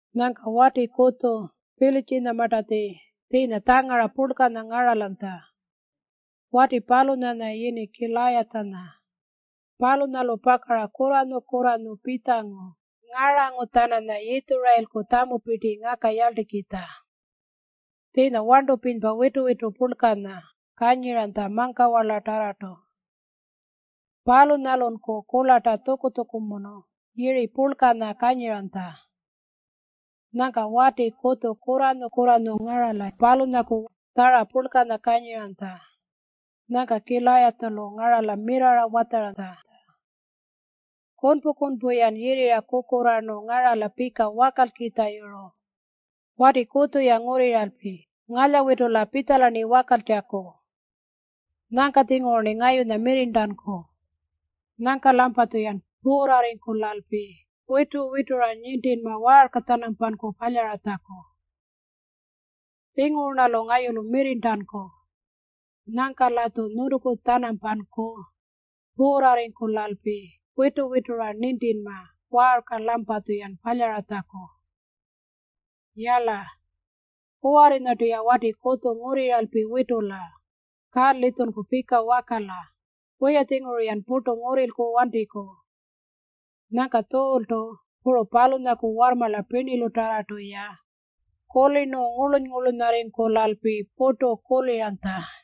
Nyangka wati kutju Pilitjinyamartatji tjiinya tjangara purlkanya ngaralanytja. Wati palunyanya yini Kilayatjanya. Palunyalu pakara kurranyu-kurranyu pitjangu ngarangu-tjananya Yitjurayilku tjamupirti ngakayarltikitja. Tjiinya warntupirinypa witu-witu purlkanya kanyiranytja mangkawarlatarrartu. Palunyalunku kurlarta tjuku-tjukumunu yiri purlkanya kanyiranytja. Nyangka wati kutju kurranyu-kurranyu ngarala-ra tjara purlkanya kanyiranytja. Nyangka Kilayatjalu ngarala mirrarra watjaranytja, “Kunpu-kunpu-yan yirrira kukurraarnu ngarala pika wakalkitjayuru. Wati kutju-ya ngurriralpi ngalyawitula pitjala-rni wakaltjaku. Nyangka-tjinguru-rni ngayunya mirrirntanku. Nyangka-lampatjuyan puurrarringkulalpi witu-witura nintinma waarka-tjanampanku palyaratjaku. Tjinguru-rnalu ngayulu mirrirntanku. Nyangka-latju nyuntuku-tjanampanku puurrarringkulalpi witu-witura nintinma waarka-lampatjuyan palyaratjaku. Yala, kuwarrinyartu-ya wati kutju ngurriralpi witula. Ka-litjunku pika wakala. Wiya-tjinguru-yan purtu ngurrilku wantiku.” Nyangka Tjuultu puru palunyaku warrmarla pirnilutarrartu-ya kulirnu ngurluny-ngurlunyarringkulalpi purtu kuliranytja.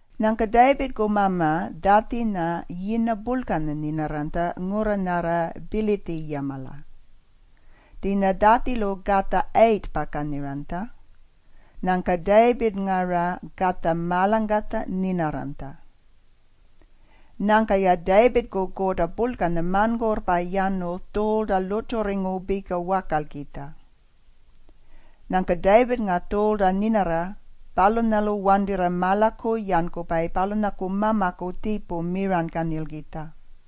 Nyangka Tayipirrku mama Tjatjinya yirna purlkanya nyinarranytja ngurra nyarra Pitjiliyamala. Tjiinya Tjatjilu katja 8-pa kanyiranytja. Nyangka Tayipirrnga-ra katja marlangkatjanya nyinarranytja. Nyangka-ya Tayipirrku kurta purlkanya marnkurrpa yanu Tjuulta lurrtjurringu pika wakalkitja. Nyangka Tayipirrnga Tjuulta nyinarra palunyalu wantirra marlaku yankupayi palunyaku mamaku tjiipu miranykanyilkitja.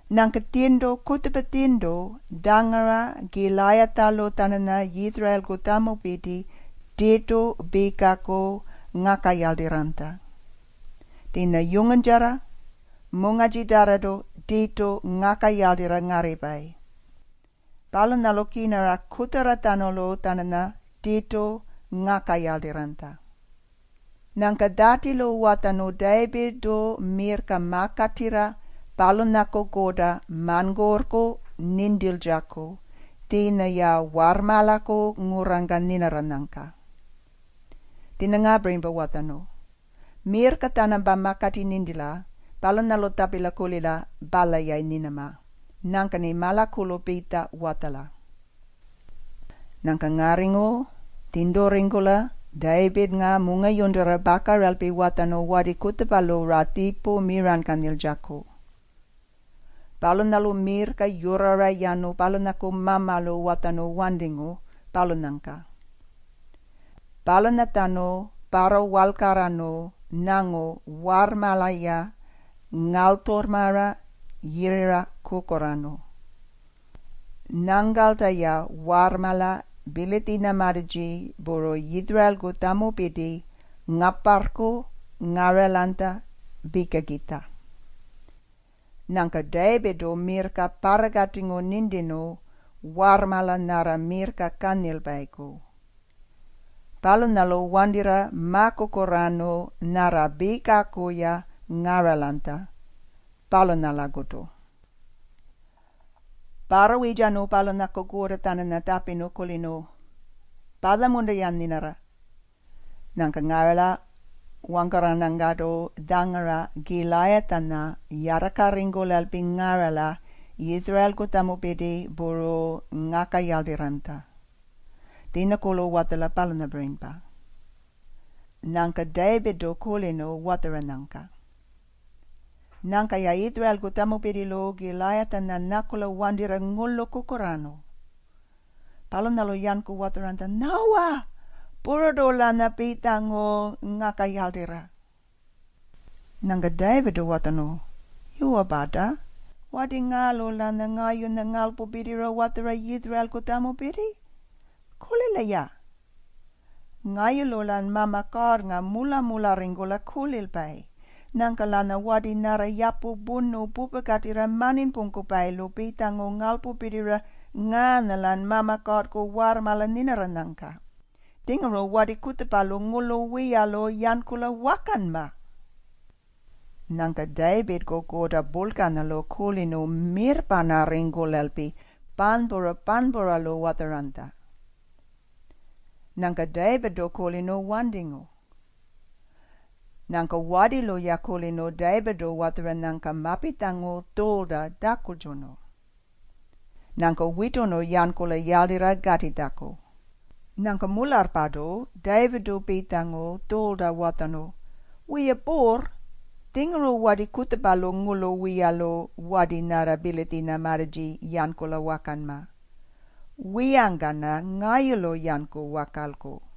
Nyangka tjirntu kutjupa tjirntu tjangara Kilayatjalu-tjananya Yitjurayilku tjamupirti tirtu pikaku ngakayarltirranytja. Tjiinya yunguntjarra, mungarrtjitarrartu tirtu ngakayarltirra ngarripayi. Palunyalu kirnara kutjarratjanulu-tjananya tirtu ngakayarltirranytja. Nyangka Tjatjilu watjarnu Tayipirrtu mirrka makatirra palunyaku kurta marnkurrku nintiltjaku tjiinya-ya warrmarlaku ngurrangka nyinarranyangka. Tjiinya ngaapirinypa watjarnu, “Mirrka-tjanampa makati nintila. Palunyalu tjapila. Palya-yayi nyinama? Nyangka-rni marlakulu pitja watjala.” Nyangka ngarringu tjirnturringkula Tayipirrnga mungayurntura pakaralpi watjarnu wati kutjupalu-ra tjiipu miranykanyiltjaku. Palunyalu mirrka yurrara yanu palunyaku mamalu watjarnu wantingu, palunyangka. Palunyatjanu parrawaalkarrarnu nyangu warrmarla-ya ngalytjurrmara yirrira kukurraarnu. Nyangkalta-ya warrmarla Pilitjinyamartatji puru Yitjurayilku tjamupirti ngaparrku ngaralanytja pikakitja. Nyangka Tayipirrtu mirrka parrakatingu nintirnu warrmarla nyarra mirrka kanyilpayiku. Palunyalu wantirra makukurraarnu nyarra pikaku-ya ngaralanytja, palunyalakutu. Parrawirrtjarnu palunyaku kurta-tjananya tjapirnu, “Palya-munta-yan nyinarra?” Nyangka ngarala wangkarranyangkartu tjangara Kilayatjanya yartakarringkulalpi ngarala Yitjurayilku tjamupirti puru ngakayarltirranytja. Tjiinyakurlu watjala, palunyapirinypa. Nyangka Tayipirrtu kulirnu watjaranyangka. Nyangka-ya Yitjurayilku tjamupirtilu Kilayatjanya nyakula wantirra ngurlu kukurraarnu. Palunyalu-yanku watjaranytja, “Nyawa. Pururtu-lanya pitjangu ngakayarltirra.” Nyangka Tayipirrtu watjarnu, “Yuwa-parta, wati ngaalu-lanya ngayunya ngarlpupirtira watjara Yitjurayilku tjamupirti? Kulila-ya. Ngayulu-lan Mama Kuurrnga mula-mularringkula kulilpayi. Nyangka-lanya wati nyarra yapu purnu pupakatirra marninypungkupayilu pitjangu ngarlpupirtira ngaanya-lan Mama Kuurrku warrmarla nyinarranyangka. Tjinguru wati kutjupalu ngurlu wiyalu yankula wakanma.” Nyangka Tayipirrku kurta purlkanyalu kulirnu mirrparnarringkulalpi panypura-panypuralu watjaranytja. Nyangka Tayipirrtu kulirnu wantingu. Nyangka watilu-ya kulirnu Tayipirrtu watjaranyangka mapitjangu Tjuulta tjakultjunu. Nyangka witurnu yankula yarltirra katitjaku. Nyangka mularrpartu Tayipirrtu pitjangu Tjuulta watjarnu, “Wiya puurr, tjinguru wati kutjupalu ngurlu wiyalu wati nyarra Pilitjinyamartatji yankula wakanma. Wiyangka-rna ngayulu yanku wakalku.”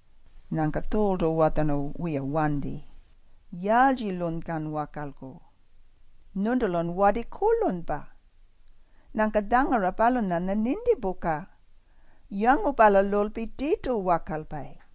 Nyangka Tjuultu watjarnu, “Wiya wanti. Yaaltjilunykan wakalku? Nyuntulun wati kurlunypa. Nyangka tjangara palunyanya nintipuka. Yangupalalulpi tirtu wakalpayi.”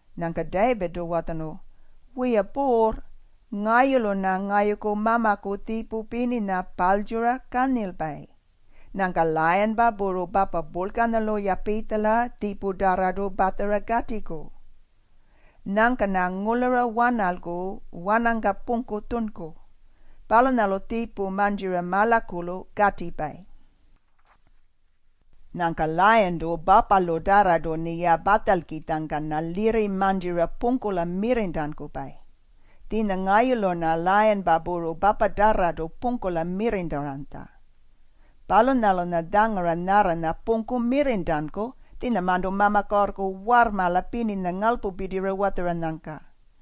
Nyangka Tayipirrtu watjarnu, “Wiya puurr, ngayulu-rna ngayuku mamaku tjiipu pirninya paalytjura kanyilpayi. Nyangka layinpa puru papa purlkanyalu-ya pitjala tjiiputarrartu patjara katiku. Nyangka-rna ngurlura wanalku wanangka pungku tjunku. Palunyalu tjiipu mantjira marlakulu katipayi. Nyangka layintu papalutarrartu-rniya patjalkitjangka-rna lirri mantjira pungkula mirrirntankupayi. Tjiinya ngayulu-rna layinpa puru papatarrartu pungkula mirrirntaranytja. Palunyalu-rna tjangara nyarranya pungku mirrirntanku, tjiinyamarntu Mama Kuurrku warrmarla pirninya ngarlpupirtira watjaranyangka.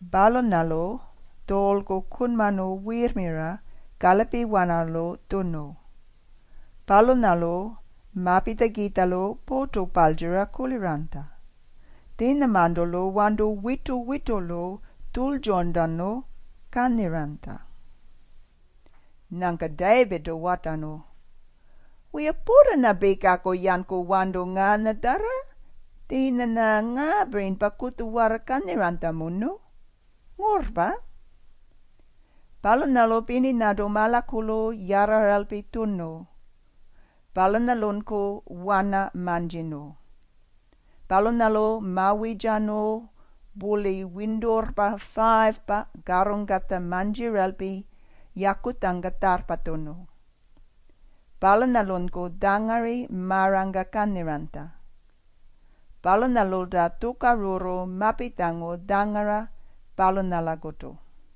Palunyalu Tjuulku kunmarnu wirrmira kalipiwanalu tjunu. Palunyalu mapitjakitjalu purtu paltjura kuliranytja. Tjiinyamarntu-lu warntu witu-witulu tjultjurntanu kanyiranytja. Nyangka Tayipirrtu watjarnu, “Wiya, purtu-rna pikaku yanku warntu ngaanyatjarra. Tjiinya-rna ngaapirinypa kutjuwarra kanyiranytjamunu, ngurrpa.” Palunyalu pirninyartu marlakulu yarraralpi tjunu. Palunyalunku wana mantjirnu. Palunyalu mawirrtjarnu purli winturrpa 5-pa karrungkatja mantjiralpi yakutjangka tjarrpatjunu. Palunyalunku tjangari marangka kanyiranytja. Palunyalulta tjukarurru mapitjangu tjangara palunyalakutu.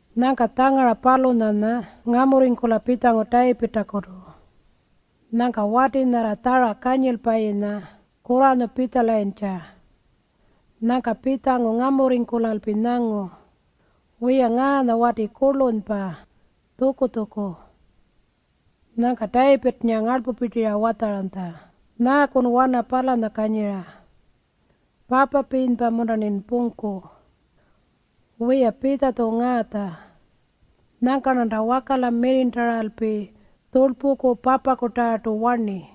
Nyangka tjangara palunyanya ngamurringkula pitjangu Tayipirrtakutu. Nyangka wati nyarra tjara kanyilpayinya kurranyu pitjalayintja. Nyangka pitjangu ngamurringkulalpi nyangu, “Wiya, ngaanya wati kurlunypa, tjuku-tjuku.” Nyangka Tayipirrnga ngarlpupirtira watjaranytja, “Nyaakun wana palanya kanyira? Papapirinypa-munta-rnin pungkukitja? Wiya, pitja-tju ngaatja. Nyangka-rnanta wakala mirrirntaralpi tjurlpuku papakutarrartu warni.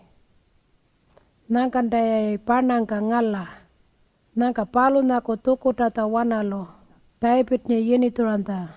Nyangkanta-yayi parnangka ngala.” Nyangka palunyaku tjukurrtatjawanalu Tayipirrnga yinitjuranytja.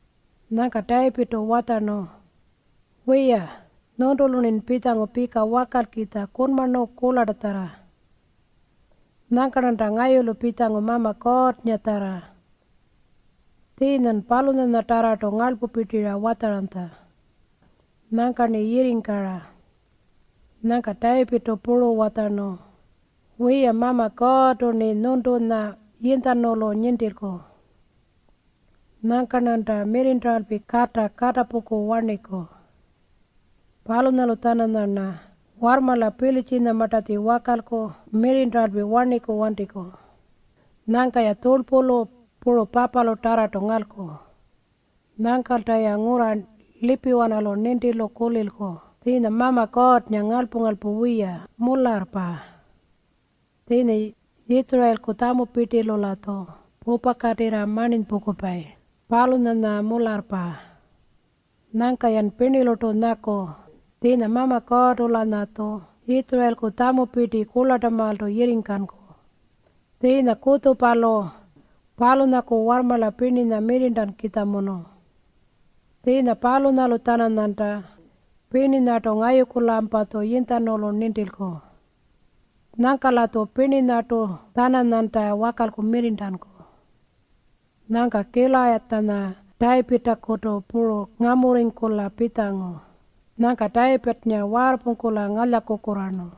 Nyangka Tayipirrtu watjarnu, “Wiya, nyuntulu-rnin pitjangu pika wakalkitja kunmarnu kurlartatjarra. Nyangka-rnanta ngayulu pitjangu Mama Kuurrngatjarra. Tjiinyan palunyanyatarrartu ngarlpupirtira watjaranytja. Nyangka-rni yirringkara.” Nyangka Tayipirrtu puru watjarnu, “Wiya, Mama Kuurrtu-rni nyuntunya yinytjanulu nintilku. Nyangka-rnanta mirrirntaralpi kata katapungku warniku. Palunyalu-tjananyarna warrmarla Pilitjinyamartatji wakalku mirrirntaralpi warniku wantiku. Nyangka-ya tjurlpulu puru papalutarrartu ngalku. Nyangkalta-ya ngurra lipiwanalu nintilu kuliku tjiinya Mama Kuurrnga ngarlpu-ngarlpu wiya, mularrpa. Tjiinya Yitjurayilku tjamupirtilu-latju pupakatirra marninypungkupayi, palunyanya mularrpa. Nyangka-yan pirnilurtu nyaku tjiinya Mama Kuurrtu-lanyatju Yitjurayilku tjamupirti kurlartamaaltu yirringkanku. Tjiinya kutjupalu palunyaku warrmarla pirninya mirrirntankukitjamunu. Tjiinya palunyalu-tjananyanta pirninyartu ngayuku-lampatju yinytjanulu nintilku. Nyangka-latju pirninyartu-tjananyanta wakalku mirrirntanku.” Nyangka Kilayatjanya Tayipirrtakutu puru ngamurringkula pitjangu. Nyangka Tayipirrnga waarrpungkula ngalyakukurraarnu.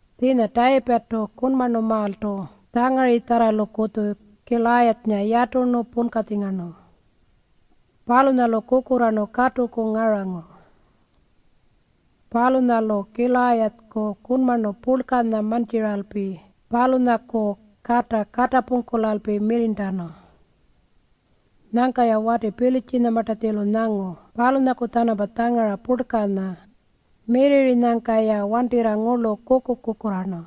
Tjiinya Tayipirrtu kunmarnumaaltu tjangaritjarralukutju Kilayatjanya yaturnu punkatjingarnu. Palunyalu kukurraarnu katuku ngarangu. Palunyalu Kilayatjaku kunmarnu purlkanya mantjiralpi palunyaku kata katapungkulalpi mirrirntanu. Nyangka-ya wati Pilitjinyamartatjilu nyangu palunyaku-tjanampa tjangara purlkanya mirrirrinyangka-ya wantirra ngurlu kuku-kukurraarnu.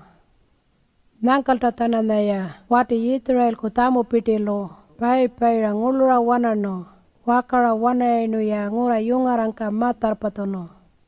Nyangkalta-tjananyaya wati Yitjurayilku tjamupirtilu payi-payira ngurlura wanarnu. Wakara-wanarayirnu-ya ngurra yungarrangka ma-tjarrpatjunu.